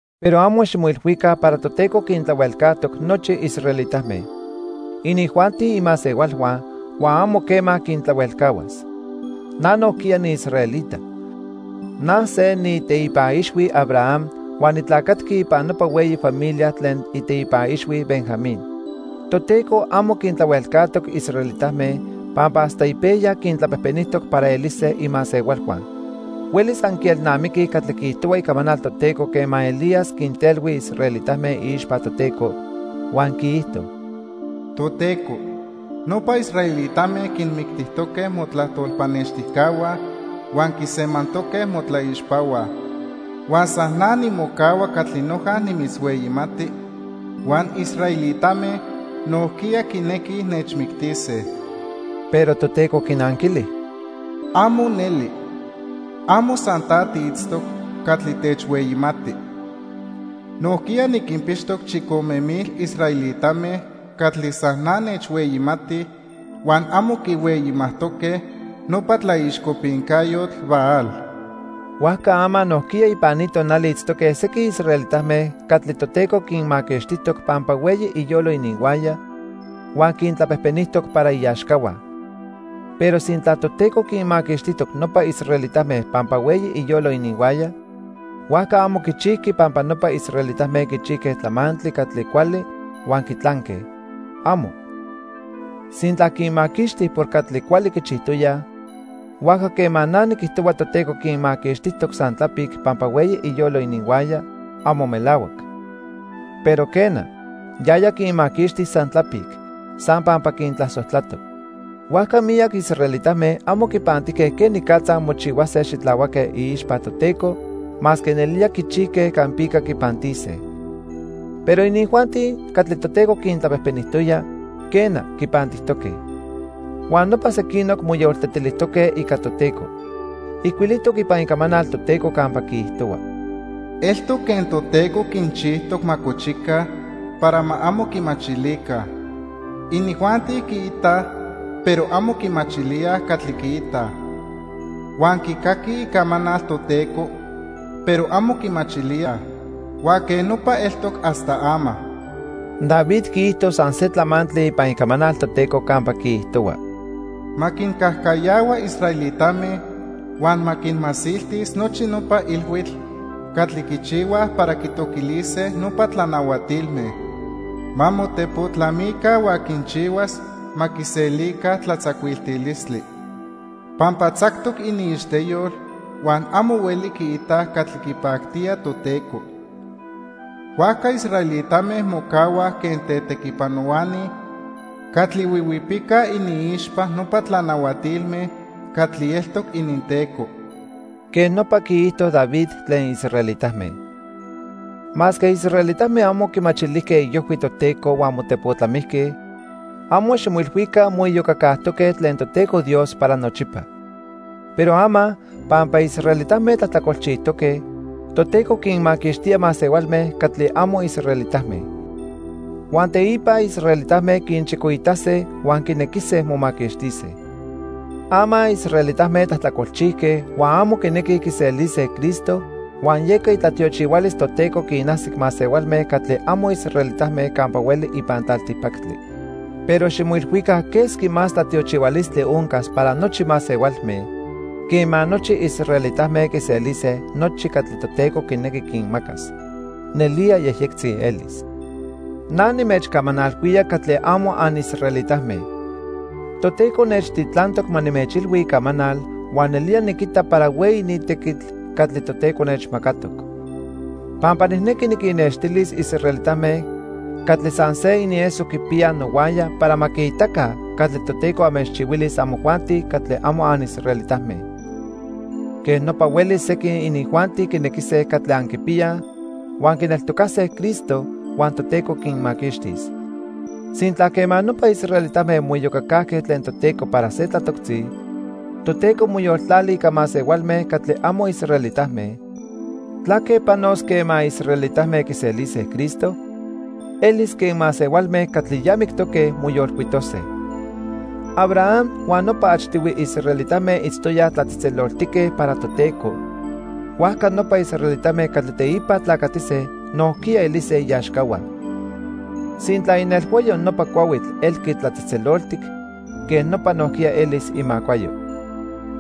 Pero amo ximoilhuica para Toteco quintlahuelcajtoc nochi israelitame. Inijuanti imasehualhua, huan amo quema quintlahuelcahuas. Na nojquiya niisraelita. Na se niiteipa ixhui Abraham huan nitlacatqui ipan nopa hueyi familia tlen iteipa ixhui Benjamín. Toteco amo quintlahuelcajtoc israelitame pampa hasta ipejya quintlapejpenijtoc para elise imasehualhua. Huelis anquielnamiquij catli quiijtohua Icamanal Toteco quema Elías quintelhui israelitame iixpa Toteco, huan quiijto: "Toteco, nopa israelitame quinmictijtoque motlajtol pannextijcahua huan quisemantoque motlaixpahua. Huan san na nimocahua catli noja nimitzhueyimati huan israelitame nojquiya quinequij nechmictise." Pero Toteco quinanquili: "¡Amo neli! Amo san ta tiitztoc catli techhueyimati. Nojquiya niquinpixtoc chicome mil israelitame catli san na nechhueyimatij huan amo quihueyimajtoque nopa tlaixcopincayotl Baal." Huajca ama nojquiya ipan ni tonali itztoque sequin israelitame catli Toteco quinmaquixtijtoc pampa hueyi iyolo ininhuaya huan quintlapejpenijtoc para iaxcahua. Pero sintla Toteco quinmaquixtijtoc nopa israelitame pampa hueyi iyolo ininhuaya, huajca amo quichijqui pampa nopa israelitame quichijque tlamantli catli cuali huan quitlanque. ¡Amo! Sintla quinmaquixti por catli cuali quichijtoyaj, huajca quema na niquijtohua Toteco quinmaquixtijtoc san tlapic pampa hueyi iyolo ininhuaya, amo melahuac. Pero quena, yaya quinmaquixti san tlapic, san pampa quintlasojtlatoc. Huajca miyac israelitame amo quipantijque quenicatza mochihuase xitlahuaque iixpa Toteco, masque nelía quichijque campica quipantise. Pero inijuanti catli Toteco quintlapejpenijtoya, quena, quipantijtoque. Huan nopa sequinoc moyoltetilijtoque ica Toteco. Ijcuilijtoc ipan Icamanal Toteco campa quiijtohua: "Eltoc quen Toteco quinchijtoc ma cochica para ma amo quimachilica. Inijuanti quiitaj, pero amo quimachilíaj catli quiitaj, huan quicaquij Icamanal Toteco, pero amo quimachilíaj. Huan quej nopa eltoc hasta ama." David quiijto san se tlamantli ipan Icamanal Toteco campa quiijtohua: "Ma quincajcayahua israelitame huan ma quinmasiltis nochi nopa ilhuitl catli quichihuaj para quitoquilise nopa tlanahuatilme. Ma motepotlamica huan quinchihuas ma quiselica tlatzacuiltilistli. Pampa tzactoc iniixteyol huan amo hueli quiitaj catli quipactía Toteco. Huajca israelitame mocahuaj quen tetequipanohuani catli huihuipicaj iniixpa nopa tlanahuatilme catli eltoc ininteco." Quej nopa quiijto David tlen israelitame. Masque israelitame amo quimachilijque iojhui Toteco huan motepotlamijque, amo ximoilhuica moiyocacajtoque tlen Toteco Dios para nochipa. Pero ama, pampa israelitame tlajtlacolchijtoque, Toteco quinmaquixtía masehualme catli amo israelitame. Huan teipa israelitame quinchicoitase huan quinequise momaquixtise. Ama israelitame tlajtlacolchijque huan amo quinequij quiselise Cristo huan yeca itlatiochihualis Toteco quinajsic masehualme catli amo israelitame campa hueli ipan tlaltipactli. Pero ximoilhuica quesqui más tlatiochihualistli oncas para nochi masehualme quema nochi israelitame quiselise nochi catli Toteco quinequi quinmacas. Nelía yejyectzi elis. Na nimechcamanalhuía catli amo anisraelitame. Toteco nechtitlantoc ma nimechilhui Icamanal huan nelía niquita para hueyi ni tequitl catli Toteco nechmacatoc. Pampa nijnequi niquinnextilis israelitame catli san se inieso quipiyaj nohuaya para ma quiitaca catli Toteco anmechchihuilis amojuanti catli amo anisraelitame. Quen nopa huelis sequin inijuanti quinequise catli anquipiyaj huan quineltocase Cristo, huan Toteco quinmaquixtis. Sintla quema nopa israelitame moiyocacajque tlen Toteco para se tlatoctzi, Toteco moyoltlali ica masehualme catli amo israelitame, ¿tlaque panos quema israelitame quiselise Cristo? Elis quen masehualme catli ya mictoque moyolcuitose. Abraham huan nopa achtihui israelitame itztoyaj tlatzejtzeloltique para Toteco, huajca nopa israelitame catli teipa tlacatise nojquiya elise iaxcahua. Sintla inelhuayo nopa cuahuitl elqui tlatzejtzeloltic, quej nopa nojquiya elis imacuayo.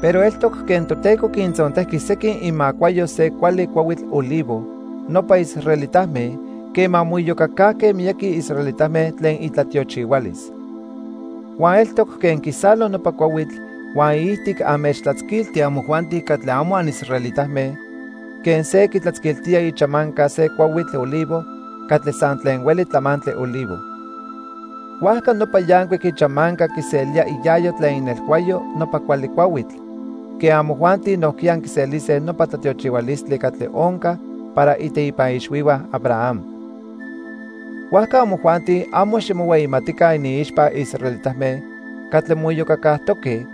Pero eltoc quen Toteco quintzontejqui sequin imacuayo se cuali cuahuitl olivo, nopa israelitame, quema moiyocacajque miyaqui israelitame tlen itlatiochihualis. Huan eltoc quen quisalo nopa cuahuitl huan iijtic anmechtlatzquilti amojuanti catli amo anisraelitame quen se quitlatzquiltía ichamanca se cuahuitl olivo catli san tlen hueli tlamantli olivo. Huajca nopa yancuic ichamanca quiselía iayo tlen inelhuayo nopa cuali cuahuitl, quen amojuanti nojquiya anquiselise nopa tlatiochihualistli catli onca para iteipa ixhuihua Abraham. Huajca amojuanti, amo ximohueyimatica iniixpa israelitame catli moiyocacajtoque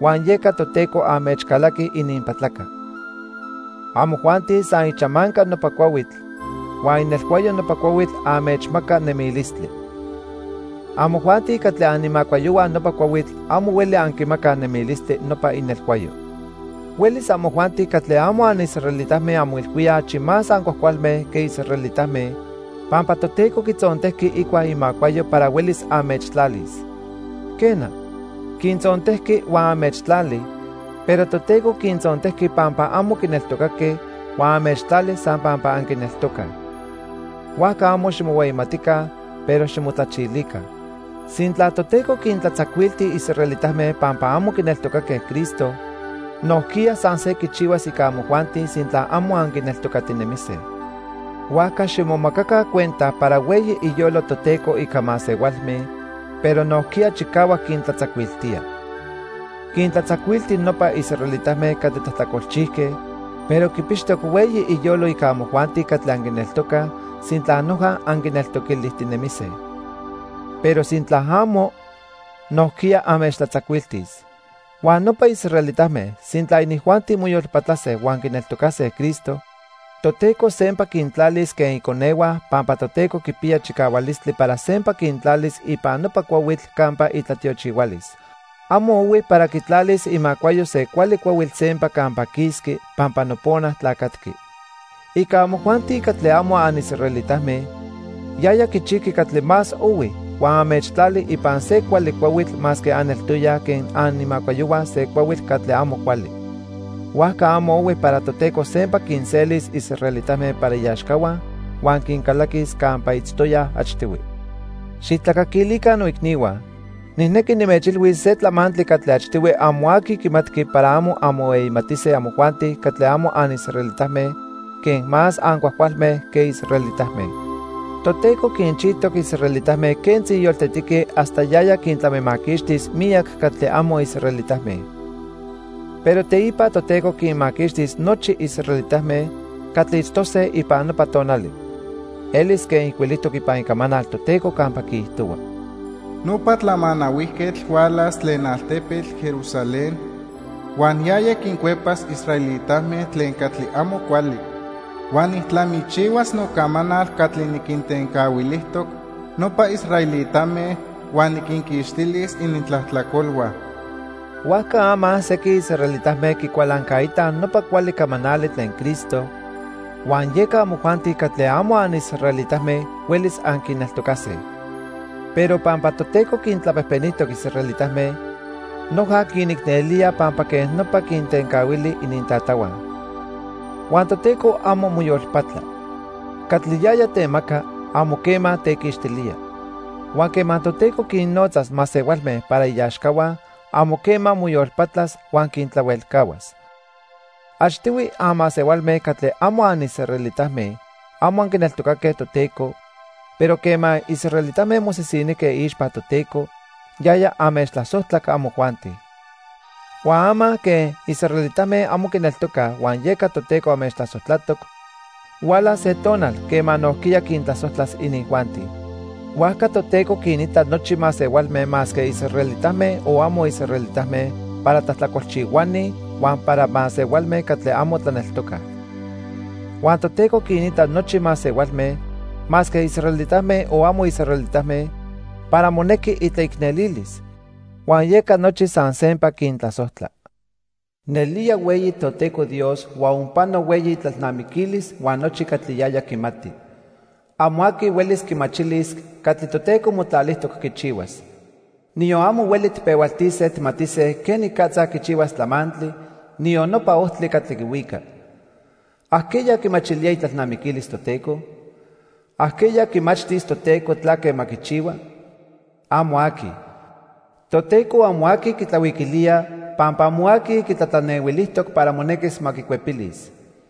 huan yeca Toteco anmechcalaqui ininpatlaca. Amojuanti san ichamanca nopa cuahuitl, huan inelhuayo nopa cuahuitl anmechmaca nemilistli. Amojuanti catli animacuayohua nopa cuahuitl amo hueli anquimacaj nemilistli nopa inelhuayo. Huelis amojuanti catli amo anisraelitame anmoilhuíaj achi más ancuajcualme que israelitame pampa Toteco quitzontejqui icua imacuayo para huelis anmechtlalis. Quena, quintzontejqui huan anmechtlali, pero Toteco quintzontejqui pampa amo quineltocaque huan anmechtlali san pampa anquineltocaj. Huajca amo ximohueyimatica, pero ximotlachilica. Sintla Toteco quintlatzacuilti israelitame pampa amo quineltocaque Cristo, nojquiya san se quichihuas ica amojuanti sintla amo anquineltocatinemise. Huajca ximomacaca cuenta para hueyi iyolo Toteco ica masehualme, pero nojquiya chicahuac quintlatzacuiltía. Quintlatzacuilti nopa israelitame catli tlajtlacolchijque, pero quipixtoc hueyi iyolo ica amojuanti catli anquineltocaj sintla noja anquineltoquilijtinemise. Pero sintla amo, nojquiya anmechtlatzacuiltis. Huan nopa israelitame, sintla inijuanti moyolpatlase huan quineltocase Cristo, Toteco sempa quintlalis quen iconehua pampa Toteco quipiya chicahualistli para sempa quintlalis ipan nopa cuahuitl campa itlatiochihualis. Amo ohui para quitlalis imacuayo se cuali cuahuitl sempa campa quisqui pampa nopona tlacatqui. Ica amojuanti catli amo anisraelitame, yaya quichijqui catli más ohui huan anmechtlali ipan se cuali cuahuitl masque aneltoyaj quen animacuayohua se cuahuitl catli amo cuali. Huajca amo ohui para Toteco sempa quinselis israelitame para iaxcahua huan quincalaquis campa itztoyaj achtihui. Xijtlacaquilica noicnihua, nijnequi nimechilhuis se tlamantli catli achtihui amo aqui quimatqui para amo anmohueyimatise amojuanti catli amo anisraelitame quen más ancuajcualme quej israelitame. Toteco quinchijtoc israelitame quentzi yoltetique hasta yaya quintlamimaquixtis miyac catli amo israelitame. Pero teipa Toteco quinmaquixtis nochi israelitame catli itztose ipan nopa tonali. Elis quen ijcuilijtoc ipan Icamanal Toteco campa quiijtohua: "Nopa Tlamanahuijquetl hualas tlen altepetl Jerusalén. Huan yaya quincuepas israelitame tlen catli amo cuali. Huan nijtlamichihuas nocamanal catli niquintencahuilijtoc nopa israelitame huan niquinquixtilis inintlajtlacolhua." Huajca ama sequin israelitame quicualancaitaj nopa cuali camanali tlen Cristo, huan yeca amojuanti catli amo anisraelitame huelis anquineltocase. Pero pampa Toteco quintlapejpenijtoc israelitame, noja quinicnelía pampa quej nopa quintencahuili inintatahua. Huan Toteco amo moyolpatla. Catli yaya temaca, amo quema tequixtilía. Huan quema Toteco quinnotzas masehualme para iaxcahua, amo quema moyolpatlas huan quintlahuelcahuas. Achtihui anmasehualme catli amo anisraelitame amo anquineltocaque Toteco, pero quema israelitame mosisinijque iixpa Toteco, yaya anmechtlasojtlac amojuanti. Huan ama quen israelitame amo quineltocaj huan yeca Toteco anmechtlasojtlatoc, hualas se tonal quema nojquiya quintlasojtlas inijuanti. Huajca Toteco quinita nochi masehualme masque israelitame o amo israelitame para tlajtlacolchihuani huan para masehualme catli amo tlaneltocaj. Huan Toteco quinita nochi masehualme, masque israelitame o amo israelitame, para monequi itlaicnelilis, huan yeca nochi san sempa quintlasojtla. ¡Nelía hueyi Toteco Dios huan onpano hueyi itlalnamiquilis huan nochi catli yaya quimati! Amo aqui huelis quimachilis catli Toteco motlalijtoc quichihuas. Niyon amo hueli tijpehualtise tijmatise quenicatza quichihuas tlamantli, niyon nopa ojtli catli quihuica. ¿Ajqueya quimachilía itlalnamiquilis Toteco? ¿Ajqueya quimachtis Toteco tlaque ma quichihua? ¡Amo aqui! Toteco amo aqui quitlahuiquilía pampa amo aqui quitlatlanehuilijtoc para monequis ma quicuepilis.